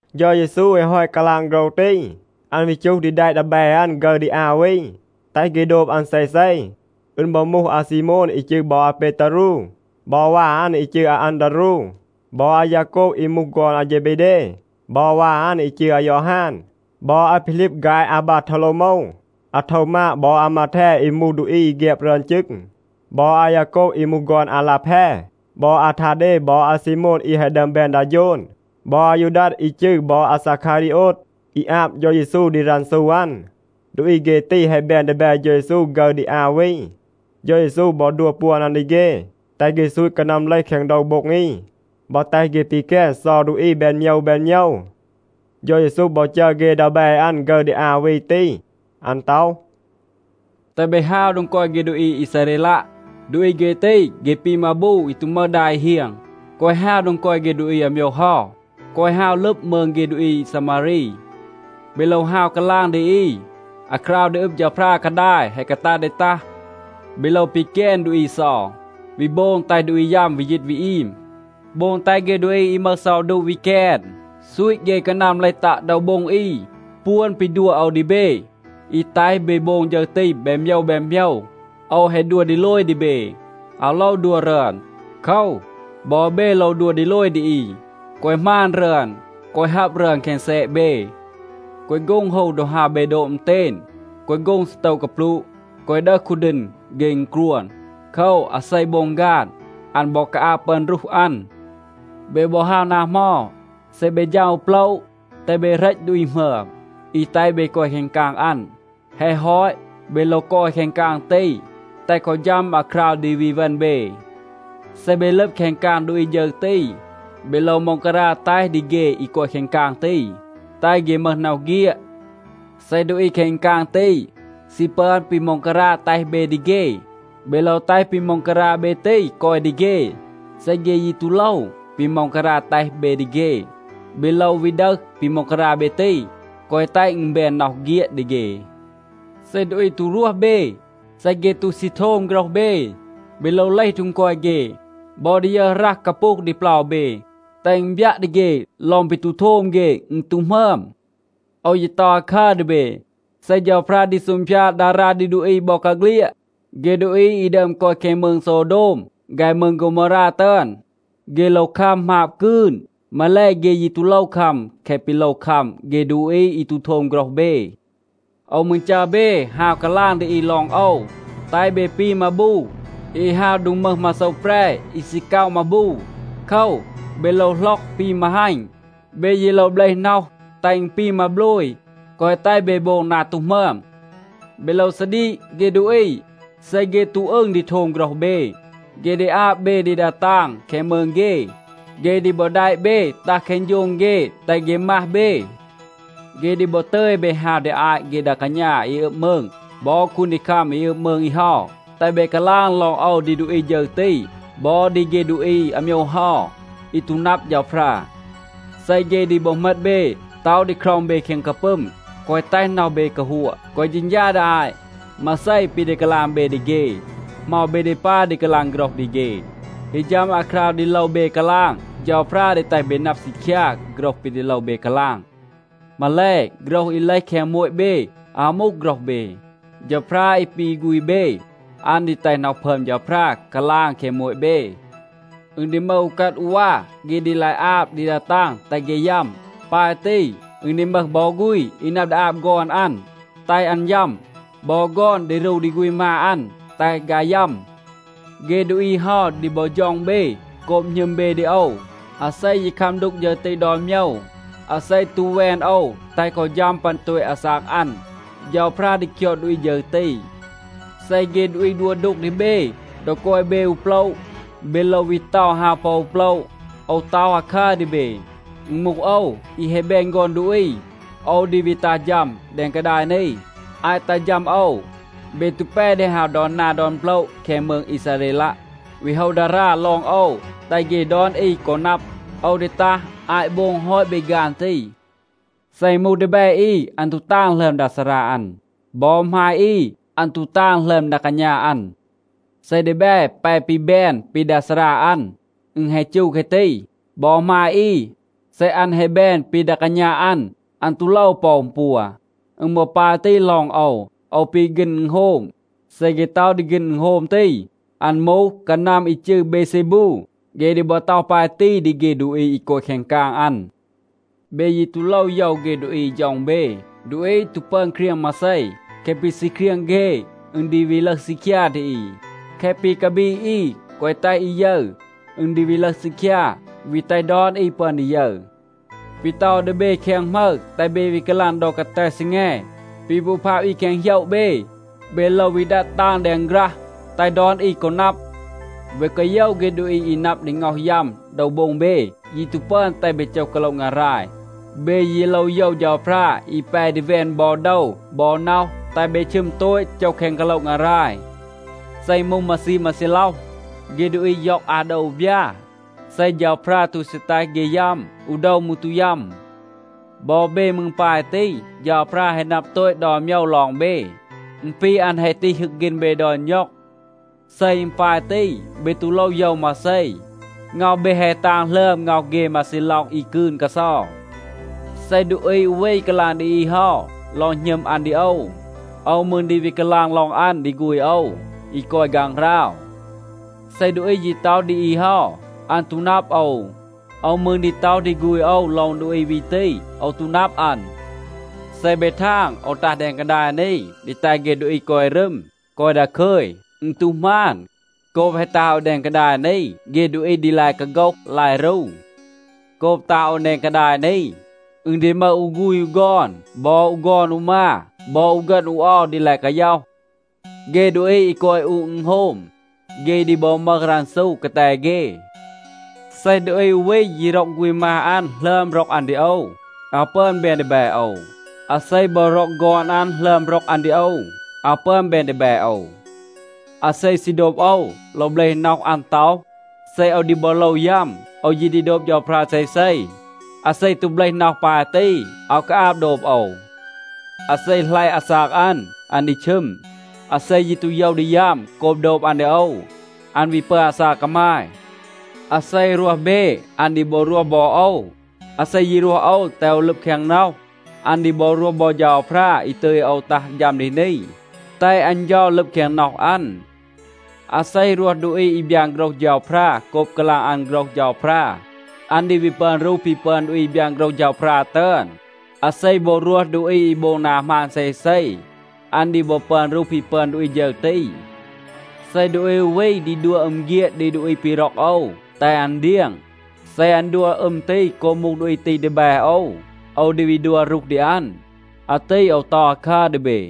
เฌา เยซู แฮะ ฮอต กาลาง โฆรห ตี, อัน วี จูห ดี แดะ ดีแบ อัน ฆึร ดี อา วี, แตห เฆ โดบ อัน เซเซ. อึณ บอ มูห อาซีโมน อี จืร บอ อาเปตารู บอ วา อัน อี จืร อาอันดารู บอ อายาโกบ อี มูห ฆอน อาเฌเบเด บอ วา อัน อี จืร อายอฮาน บอ อาพีลีบ ฆาย อาบาโทวโลวโมว, อาโทวมาด บอ อามาแท อี มูห ดูอี แฆบ รึอน จึง บอ อายาโกบ อี มูห ฆอน อาลาแพ บอ อาทาเด บอ อาซีโมน อี แฮะ ดึอม แบน ดา โฌน บอ อายูดัด อี จืร บอ อาซาคารีโอด, อี อาบ เฌา เยซู ดี รันซู อัน. ดูอี เฆ ตี แฮะ แบน ดีแบ เฌา เยซู ฆึร ดี อา วี. เฌา เยซู บอ ดัว ปวน อัน ดี เฆ, แตห เฆ ซูต กานัม เลห แคง โดว โบ็ง อี บอ แตห เฆ ปีแกน เซา ดูอี แบน โมยว แบน โมยว. เฌา เยซู บอ จัร เฆ ดีแบ อัน ฆึร ดี อา วี ตี. อัน ต็อห, “แตห เบ ฮาว โดง กอย เฆ ดูอี อีซาเรลัะ. ดูอี เฆ ตี, เฆ ปี มาบู อี ตู มึห ดา อี เฮียง. แกวะ ฮาว โดง กอย เฆ ดูอี อาโมยว เฮา. แกวะ ฮาว ลึบ มืง เฆ ดูอี ซามารี. เบ โลว ฮาว กาลาง ดี อี, ‘อาคราว ดี อึบ เฌาพรา กาดาย แฮะ กาตัด ดี ตัห.’ เบ โลว ปีแกน ดูอี เซา, วี โบง แตห ดูอี ยัม วี ยีต วี อีม. โบง แตห เฆ ดูอี อี มึห เซา ดูะa วี แกน, ซูต เฆ กานัม เลห ตัะ โดว โบ็ง อี. ปวน ปี ดัว โอว ดี เบ อี แตห เบ โบง ฌึร ตี แบน โมยว แบน โมยว, โอว แฮะ ดัว ดีโลย ดี เบ, อาว โลว ดัว รึอน. โคว, บอ เบ โลว ดัว ดีโลย ดี อี, แกวะ หมาณ รึอน. แกวะ ฮับ รึอน แคง แซะ เบ. แกวะ โฆ็ง ฮู ดอ ฮาว เบ โดบ อึณเตณ. แกวะ โฆ็ง ซีโตว กาปลูะ. แกวะ ดึห คูดีณ เฆ อึณกรวน. โคว, อาเซ โบง ฆาน, อัน บอ กาอาบ ปึอน รูห อัน. เบ บอ ฮาว นา เหมา, เซ เบ ฌัม อู โปละ, แตห เบ เหรต ดูอี หมึอม, อี แตห เบ กอย แคง กาง อัน. แฮะ ฮอต, เบ โลว กอย แคง กาง ตี, แตห กอ ฌัม อาคราว ดี วี เวณ เบ. เซ เบ ลึบ แคง กาง ดูอี ฌึร ตี, เบ โลว ม็องการา แตห ดี เฆ อี กอย แคง กาง ตี, แตห เฆ มึห น็อห เฆียด. เซ ดูอี แคง กาง ตี ซี ปึอน ปี ม็องการา แตห เบ ดี เฆ, เบ โลว แตห ปี ม็องการา เบ ตี กอย ดี เฆ. เซ เฆ ยี ตู โลว ปี ม็องการา แตห เบ ดี เฆ, เบ โลว วี ดึห ปี ม็องการา เบ ตี, แกวะ แตห อึณ แบน น็อห เฆียด ดี เฆ. เซ ดูอี ตู รวห เบ, เซ เฆ ตู ซี โทม โฆรห เบ, เบ โลว เลห โดง กอย เฆ บอ ดียึห รัห กาปูห ดี เปลา เบ, แตห อึณ บยัะ ดี เฆ ลอง ปี ตู โทม เฆ, อึณ ตู หมึอม. โอว ยี ต็อห อาคัร ดี เบ. เซ เฌาพรา ดี ซูงพยาด ดารา ดี ดูอี บอกาเฆลียด, เฆ ดูอี อี ดึอม กอย แคง มืง โซวโดม ฆาย มืง โฆวโมวรา ตึอน, เฆ โลว คัม หมาบ กืน. มาแล, เฆ ยี ตู โลว คัม แคะ ปี โลว คัม เฆ ดูอี อี ตู โทม โฆรห เบ. โอว มืร จัร เบ ฮาว กาลาง ดี อี ลอง โอว, แตห เบ ปี มาบู อี ฮาว โดง มึห มาโซว แปร, อี ซี ก็อะ มาบู. โคว, เบ โลว หล็อก ปี มาฮัณ. เบ ยี โลว เบลห น็อห, แตห อึณ ปี มาโบลย, แกวะ แตห เบ โบง นา ตู หมึอม. เบ โลว ซาดีก เฆ ดูอี. เซ เฆ ตู อึง ดี โทม โฆรห เบ, เฆ ดี อาบ เบ ดี ดา ตาง แคง มืง เฆ. เฆ ดี บอ แดะ เบ ตัห แคง โฌง เฆ, แตห เฆ มัห เบ. เฆ ดี บอ ตึย เบ ฮาว ดี อาต เฆ ดา กาณา อี อึบ มืง บอ คูนดีคัม อี อึบ มืง อี เฮา, แตห เบ กาลาง ลอง โอว ดี ดูอี ฌึร ตี บอ ดี เฆ ดูอี อาโมยว เฮา, อี ตู นับ เฌาพรา. เซ เฆ ดี บอ เหมต เบ, ต็อห ดี คร็อง เบ แคง กาปึม, แกวะ แตห น็อห เบ กาฮัวะ, แกวะ เฌณฌา ดี อาต, มาเซ ปี ดี กาลาง เบ ดี เฆ, เหมา เบ ดี ปาย ดี กาลาง โฆรห ดี เฆ. ฮี ฌัม อาคราว ดี โลว เบ กาลาง, เฌาพรา ดี แตห เบ นับ ซีคยา โฆรห ปี ดี โลว เบ กาลาง. มาแล, โฆรห อี เลห แคง โมต เบ อาว มูห โฆรห เบ. เฌาพรา อี ปี ฆูณ เบ, อัน ดี แตห น็อห พึอม เฌาพรา กาลาง แคง โมต เบ. อึณ ดี มึห อูกัด อูวา, เฆ ดี ลาย อาบ ดี ดา ตาง, แตห เฆ ยัม. ปาย ตี, อึณ ดี มึห บอ ฆูณ อี นับ ดี อาบ ฆอน อัน, แตห อัน ยัม. บอ ฆอน ดี รู ดี ฆูณ มา อัน, แตห ฆาย ยัม. เฆ ดูอี เฮา ดี บอ ฌ็อง เบ โกบ หณึม เบ ดี โอว. อาเซ ยี คัม ดูก ฌึร ตี ดอน โมยว, อาเซ ตู แวน โอว แตห กอ ฌัม ปัน โตต อาซาก อัน, เฌาพรา ดี คยอด ดูอี ฌึร ตี. เซ เฆ ดูอี ดัว ดูก ดี เบ ดอ กอย เบ อู โปละ, เบ โลว วี เตา ฮาว ปอ อู โปละ. โอว ต็อห อาคัร ดี เบ. อึณ มูห โอว, อี แฮะ แบน ฆอน ดูอี, โอว ดี วี ตัห ฌัม แดง กาดาย นี. อาต ตัห ฌัม โอว, เบ ตู แป ดี ฮาว ดอน นา ดอน โปละ แคง มืง อีซาเรลัะ, วี โฮว ดารา ลอง โอว, แตห เฆ ดอน อี กอ นับ. โอว ดี ตัห อาต โบง ฮอต เบ ฆาน ตี. เซ อึณ มูห ดีแบ อี, อัน ตู ตาง หลึอม ดา ซารา อัน. บอ หมาย อี, อัน ตู ตาง หลึอม ดา กาณา อัน. เซ ดีแบ แป ปี แบน ปี ดา ซารา อัน, อึณ แฮะ จู แคะ ตี. บอ หมาย อี, เซ อัน แฮะ แบน ปี ดา กาณา อัน, อัน ตู โลว ปอ อึณ ปัว. อึณ บอ ปาย ตี ลอง โอว. โอว ปี ฆีณ อึณโฮม. เซ เฆ ต็อห ดี ฆีณ อึณโฮม ตี, อัน มูห กานัม อี จืร เบเซบู,b เฆ ดี บอ ต็อห ปาย ตี ดี เฆ ดูอี อี กอย แคง กาง อัน. เบ ยี ตู โลว โยว เฆ ดูอี อี ฌ็อง เบ. ดูอี ตู ปึอน เครียง มาเซ. แคะ ปี ซี เครียง เฆ, อึณ ดี วี ลึห ซีคยา ดี อี. แคะ ปี กาบีด อี แกวะ แตห อี ยึร, อึณ ดี วี ลึห ซีคยา, วี แตห ดอน อี ปึอน ดี ยึร. ปี ต็อห โอว ดี เบ แคง หมึร, แตห เบ วี กาลาง ดอ กาแต ซีแง. ปี พูพาบ อี แคง โหยะ เบ, เบ โลว วี ดัด ตาง แดง ฆรัห, แตห ดอน อี กอ นับ. เบ แกวะ โยว เฆ ดูอี อี นับ ดี ง็อห ยัม โดว โบ็ง เบ, ยี ตู ปึอน แตห เบ โจห กาโละ งาราย. เบ ยี โลว โยว เฌาพรา อี แป ดี แวน บอ โดว บอ น็อห, แตห เบ ชึม โตต, โจห แคง กาโละ งาราย. เซ อึณ มูห มาซีม มาซีล็อห, เฆ ดูอี ย็อง อา โดว อู บยา. เซ เฌาพรา ตู ซี แตห เฆ ยัม, อู โดว มืร ตู ยัม. บอ เบ มืร ปาย ตี. เฌาพรา แฮะ นับ โตต ดอน โมยว ลอง เบ. อึณ ปี อัน แฮะ ตีห ฮึก ฆีณ เบ ดอน ณ็อง. เซ อึณ ปาย ตี, เบ ตู โลว โยว มาเซ. ง็อห เบ แฮะ ตาง หลึอม ง็อห เฆ มาซีล็อห อี กืน กาเซา. เซ ดูอี อู วี กาลาง ดี อี เฮา ลอง หณึม อัน ดี โอว, โอว มืร ดี วี กาลาง ลอง อัน ดี ฆูณ โอว, อี กอย ฆางหราว. เซ ดูอี ยี ต็อห ดี อี เฮา, อัน ตู นับ โอว, โอว มืร ดี ต็อห ดี ฆูณ โอว ลอง ดูอี วี ตี, ‘โอว ตู นับ อัน.’ เซ เบ ทาง, โอว ตัห แดง กาดาย นี, ดี แตห เฆ ดูอี กอย รึม, กอย ดาคึย, อึณ ตู หมาน. โกบ แฮะ ตัห โอว แดง กาดาย นี, เฆ ดูอี ดี ลาย กาโฆห, ลาย รู. โกบ ตัห โอว แดง กาดาย นี, อึณ ดี มึห อู ฆูณ อู ฆอน บอ อู ฆอน อู มา บอ อู ฆึณ อู เอา ดี ลาย กาย็อห. เฆ ดูอี อี กอย อู อึณโฮม, เฆ ดี บอ มึห รันซู กาแต เฆ. เซ ดูอี อู วี ยี ร็อก ฆูณ มา อัน หลึอม ร็อก อัน ดี โอว, อาว ปึอน แบน ดีแบ โอว. อาเซ บอ ร็อก ฆอน อัน หลึอม ร็อก อัน ดี โอว, อาว ปึอน แบน ดีแบ โอว. อาเซ ซี โดบ โอว โลว เบลห น็อห อัน ต็อห, ‘เซ โอว ดี บอ โลว ยัม, โอว ยี ดี โดบ เฌาพรา เซเซ.’ อาเซ ตู เบลห น็อห ปาย ตี, อาว กาอาบ โดบ โอว. อาเซ หลัยะ อาซาก อัน, อัน ดี ชึม. อาเซ ยี ตู โยว ดี ยัม โกบ โดบ อัน ดี โอว, อัน วี ปึอน อาซาก กามาย. อาเซ รวห เบ, อัน ดี บอ รวห บอ โอว. อาเซ ยี รวห โอว แตห โอว ลึบ แคง น็อห, อัน ดี บอ รวห บอ เฌาพรา อี ตึย โอว ตัห ฌัม ดี นี, แตห อัน เฌา ลึบ แคง น็อห อัน. อาเซ รวห ดูอี อี บยาน โฆรห เฌาพรา โกบ กาลาง อัน โฆรห เฌาพรา, อัน ดี วี ปึอน รูห ปี ปึอน ดูอี อี บยาน โฆรห เฌาพรา ตึอน. อาเซ บอ รวห ดูอี อี โบง นา หมาน เซเซ, อัน ดี บอ ปึอน รูห ปี ปึอน ดูอี ฌึร ตี. เซ ดูอี อู วี ดี ดัว อึม เฆียด ดี ดูอี ปี ร็อก โอว, แตห อัน เดียง, เซ อัน ดัว อึม ตี โกบ มูห ดูอี ตี ดีแบ โอว, โอว ดี วี ดัว รูห ดี อัน. อาตี โอว ต็อห อาคัร ดี เบ.”